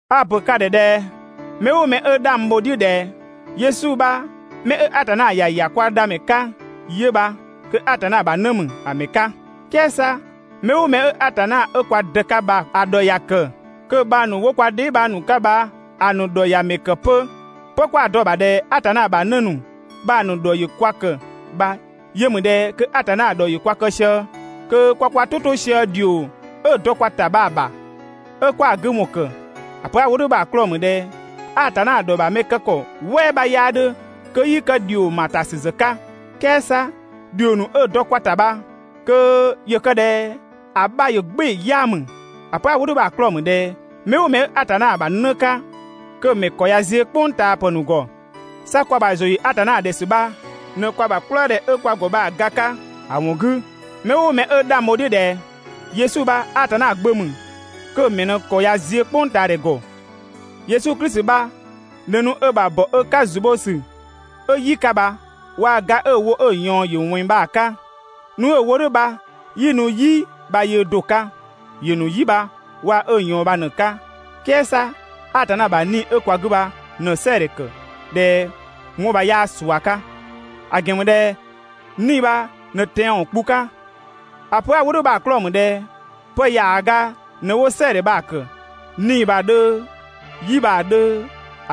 A‑ ‑pö ka ‑dhɛ ꞊dhɛ mɛ "ʋʋ mɛ 'ö 'dhang bho‑ "dhiʋ̈ ꞊dhɛ Yesu bha 'mɛ 'ö Atanna ‑ya ‑ya kwa Dhamɛ 'ka 'yö bha, kö Atanna ‑bha 'në ‑mü ‑a ‑mɛ 'ka. "Kɛɛ 'sa mɛ "ʋʋ mɛ 'ö Atanna 'ö kwa Dë 'ka bha‑ ‑dhɔ ‑ya ‑kë, kö‑ bhang ‑nu 'wo kwa dheebhang ‑nu 'ka bha‑ ‑nu ‑dhɔ ‑ya ‑mɛ ‑kë 'pö. 'Pë 'kwa‑ dɔ‑ ‑bha ꞊dhɛ Atanna ‑bha 'në ‑nu bha‑ ‑nu ‑dhɔ ‑yö kwa ‑kë bha yö ‑mü ꞊dhɛ kö Atanna ‑dhɔ ‑yö kwa kë sië, kö kwa kwa "tʋ 'to sië ‑dhio 'ö‑ dɔ kwa ‑ta bha‑ ‑bha 'ö 'kwa‑ 'gü ‑wɔn ‑kë. ‑A pö 'a‑ wo "dhʋ̈ bha‑ 'klɔɔ‑ ‑mü ꞊dhɛ Atanna ‑dhɔ ‑bha mɛ kë ‑kɔ "wɛɛ 'bha 'yaa 'dhö kö 'yii kë ‑dhio ‑ma ‑a ‑ta ‑sü ‑zë 'ka. "Kɛɛ 'sa ‑dhio ‑nu 'ö‑ dɔ kwa ‑ta bha kö ‑yö kë ꞊dhɛ ‑a 'bha ‑yö "gbɩɩ‑ 'yaa ‑mü. ‑A pö 'a‑ wo "dhʋ̈ bha‑ 'klɔɔ‑ ‑mü ꞊dhɛ mɛ "ʋʋ mɛ 'ö Atanna ‑bha 'në 'ka, kö‑ ‑mɛ ‑kɔ ꞊ya ziö "kpʋngtaapë ‑nu ‑gɔ. 'Sa kwa ‑bha ‑zʋ ‑yö Atanna ‑dhɛ ‑sü bha ꞊në kwa ‑bha "kplëëdhɛ 'ö kwa ‑gɔ bha‑ ga 'ka. ‑A ‑wɔn 'gü, 'mɛ "ʋʋ mɛ 'ö 'dhang bho‑ "dhiʋ̈ ꞊dhɛ Yesu bha Atanna Gbö ‑mü, kö‑ ‑mɛ ꞊në‑ ‑kɔ ꞊ya ziö "kpʋngtaadhɛ ‑gɔ. Yesu Klisi bha ꞊në nu ö ‑bha ‑bɔ ö 'ka ‑zu bho ‑sü 'ö "yi 'ka bha waa‑ ga 'ö‑ wo 'ö‑ ꞊yɔɔn ‑yö ꞊wɛnng bha‑ 'ka. Nu 'ö‑ wo "dhʋ̈ bha 'yii nu "yi bha yöö do‑ 'ka. ‑Yö ‑nu "yi bha waa‑ ö ꞊yɔɔn bha ꞊në‑ 'ka. "Kɛɛ 'sa Atanna ‑bha 'Nii‑ 'ö kwa 'gü bha ꞊në‑ "sɛɛdhɛ ‑kë ꞊dhɛ 'wɔn bha 'yaa ꞊sua 'ka, ‑a ‑gɛn ‑mü ꞊dhɛ 'Nii‑ bha ꞊në tɛanwɔn kpu 'ka. ‑A pö 'a‑ wo "dhʋ̈ bha‑ 'klɔɔ‑ ‑mü ꞊dhɛ pë ‑yaaga ꞊në 'wo "sɛɛdhɛ bha‑ ‑kë. 'Nii‑ bha‑ 'dhö, "yi bha‑ 'dhö,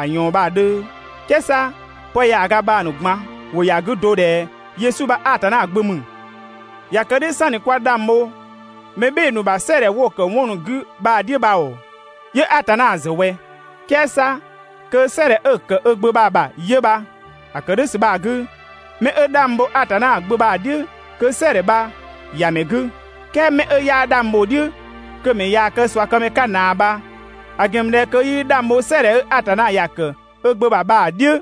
‑a ꞊yɔɔn bha‑ 'dhö, "kɛɛ 'sa pë ‑yaaga bha‑ ‑nu ꞊gban ‑wʋ ‑ya 'gü do ꞊dhɛ Yesu bha Atanna Gbö ‑mü. ꞊Ya kë "dhʋ̈ "sanni 'kwa 'dhang bho mɛ "bhɩɩ‑ ‑nu bha "sɛɛdhɛ 'wo‑ ‑kë ‑nu wo 'wɔn ‑nu 'gü bha‑ "dhiʋ̈ bha ‑oo, 'yö Atanna ‑zë ꞊wɛ? "Kɛɛ 'sa kö "sɛɛdhɛ 'ö‑ ‑kë ö Gbö bha‑ ‑bha 'yö bha! ‑A ‑kë "dhʋ̈ ‑sü bha‑ 'gü, 'mɛ 'ö 'dhang bho Atanna Gbö bha‑ "dhiʋ̈ kö "sɛɛdhɛ bha ‑ya ‑mɛ 'gü. "Kɛɛ 'mɛ 'ö 'yaa 'dhang bho‑ "dhiʋ̈ kö‑ ‑mɛ ꞊yaa‑ kë ꞊suakëmɛ 'ka ꞊naa bha, ‑a ‑gɛn ‑mü ꞊dhɛ kö 'yii 'dhang bho "sɛɛdhɛ 'ö Atanna ‑ya ‑kë ö Gbö ‑bha bha‑ "dhiʋ̈.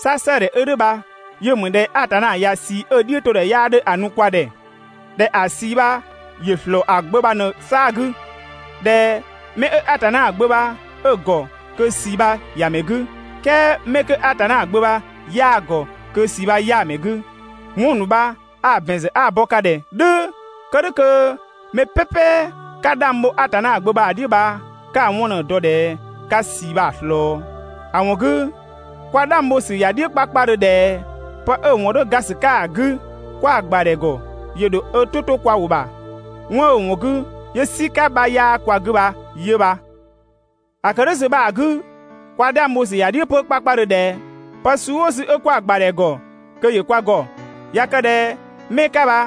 'Sa "sɛɛdhɛ 'ö "dhʋ̈ bha yö ‑mü ꞊dhɛ Atanna ꞊ya ꞊sii 'ö‑ "dhiʋ̈todhɛ 'yaa 'dhö ‑a nu kwa ‑dhɛ, ꞊dhɛ ‑a ꞊sii bha ‑yö ‑slɔɔ ‑a Gbö bha ꞊në‑ 'saa‑ 'gü. ꞊Dhɛ mɛ 'ö Atanna Gbö bha 'ö‑ ‑gɔ, kö ꞊sii bha ‑ya ‑mɛ 'gü, "kɛɛ 'mɛ 'kö Atanna Gbö bha 'yaa‑ ‑gɔ, kö ꞊sii bha 'yaa‑ ‑mɛ 'gü. 'Wɔn ‑nu bha a‑ ‑bɛn ‑zë 'a‑ bɔ ka ‑dhɛ "dhʋ̈ kë "dhʋ̈ kö mɛ "pɛpɛ 'ka 'dhang bho Atanna Gbö bha‑ "dhiʋ̈ bha 'ka‑ 'wɔn ꞊në‑ dɔ ꞊dhɛ 'ka ꞊sii bha‑ ꞊slɔɔ. ‑A ‑wɔn 'gü, kwa 'dhang bho ‑sü ‑ya "dhiʋ̈ 'kpakpadhö ꞊dhɛ 'pë 'ö‑ ‑wɔn 'dhö ga ‑sü 'ka ‑a 'gü 'kwa‑ ‑gbadhɛ ‑gɔ, ‑yö ‑dho ö "tʋ 'to kwa ‑wʋ ‑bha. 'Wɔn 'ö‑ ‑wɔn 'gü 'yö "sika 'bha 'yaa kwa 'gü bha 'yö bha. ‑A ‑kë "dhʋ̈ ‑sü bha‑ 'gü, kwa 'dhang bho ‑sü ‑ya "dhiʋ̈ 'pö 'kpakpadhö ꞊dhɛ pë suu "ʋʋ suu 'ö 'kwa‑ ‑gbadhɛ ‑gɔ kö ‑yö kwa ‑gɔ. ꞊Ya kë ꞊dhɛ 'mɛ 'ka bha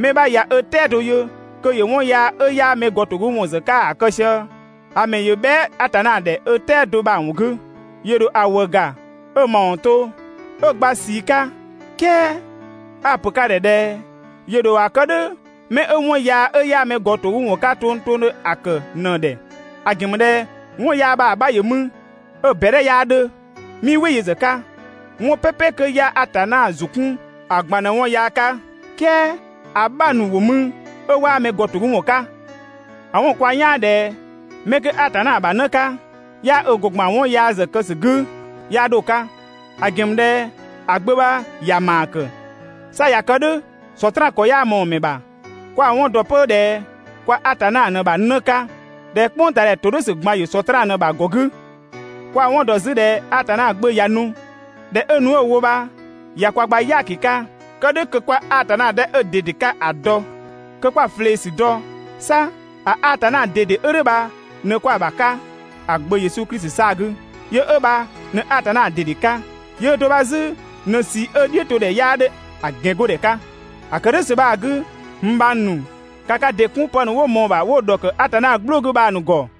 mɛ 'bha ꞊ya ö "tɛado yö kö ‑yö 'wɔn yaa 'ö 'yaa mɛgɔtogüwɔn ‑zë 'ka ‑a kë sië, ‑a ‑mɛ ‑yö bhɛa" Atanna ‑dhɛ 'ö "tɛado bha‑ ‑wɔn 'gü, ‑yö ‑dho ‑a ‑wëë ‑ga 'ö‑ ‑mawɔn to, 'ö‑ gba ꞊sii 'ka. "Kɛɛ a‑ ‑pö ka ‑dhɛ ꞊dhɛ ‑yö ‑dho ‑a kë "dhʋ̈ 'mɛ 'ö 'wɔn yaa 'ö 'yaa mɛgɔtogüwɔn 'ka tongtongdhö ‑a ‑kë ꞊në‑ ‑dhɛ. ‑A ‑gɛn ‑mü ꞊dhɛ 'wɔn yaa bha‑ 'bha ‑yö mü 'ö‑ ꞊bɛdhɛ 'yaa 'dhö. 'Mii "wɩ yö ‑zë 'ka. 'Wɔn "pɛpɛ 'kö 'yaa Atanna ‑zʋ 'kun ‑a ꞊gban ꞊në 'wɔn yaa 'ka, "kɛɛ ‑a 'bha ‑nu ‑wo mü 'ö 'waa mɛgɔtogüwɔn 'ka. ‑A 'wɔn‑ kwa "yaan ꞊dhɛ 'mɛ 'kö Atanna ‑bha 'në 'ka 'yaa ö ‑gɔ ‑gban 'wɔn yaa ‑zë kë ‑sü 'gü 'yaa 'dho‑ 'ka, ‑a ‑gɛn ‑mü ꞊dhɛ ‑a Gbö bha ‑ya ‑maa kë. 'Sa ꞊ya kë "dhʋ̈ Sɔtraan ‑kɔ 'yaa ꞊mɔɔ‑ ‑mɛ ‑bha. Kwa‑ 'wɔn ‑dɔ 'pö ꞊dhɛ kwa Atanna ꞊në ‑bha 'në 'ka, ꞊dhɛ "kpʋngtaadhɛ ‑todhʋ̈sü ꞊gban ‑yö Sɔtraan ꞊në‑ ‑bha ‑gɔ 'gü. Kwa‑ 'wɔn ‑dɔ 'zü ꞊dhɛ Atanna Gbö ꞊ya nu, ꞊dhɛ 'ö nu 'ö‑ wo bha ꞊ya kwa gba "yaaki 'ka, kë "dhʋ̈ kö 'kwa Atanna 'dhɛ 'ö‑ ꞊dede 'ka ‑a dɔ, kö 'kwa‑ ꞊flee ‑sü dɔ. 'Sa ‑a Atanna ꞊dede 'ö "dhʋ̈ bha ꞊në 'kwa‑ ‑bha 'ka ‑a Gbö Yesu Klisi 'saa‑ 'gü. Yö 'ö bha ꞊në Atanna ꞊dede 'ka, yöö do bha 'zü ꞊në ꞊sii 'ö‑ "dhiʋ̈todhɛ 'yaa 'dhö ‑a ‑gɛngodhɛ 'ka. ‑A ‑kë "dhʋ̈ ‑sü bha‑ 'gü, n bhang ‑nu, ‑ka ka ‑dɩ 'kun pë ‑nu 'wo ꞊mɔɔ‑ ‑bha 'wo‑ ‑dhɔkë Atanna "gblʋ̈ 'gü bha‑ ‑nu ‑gɔ.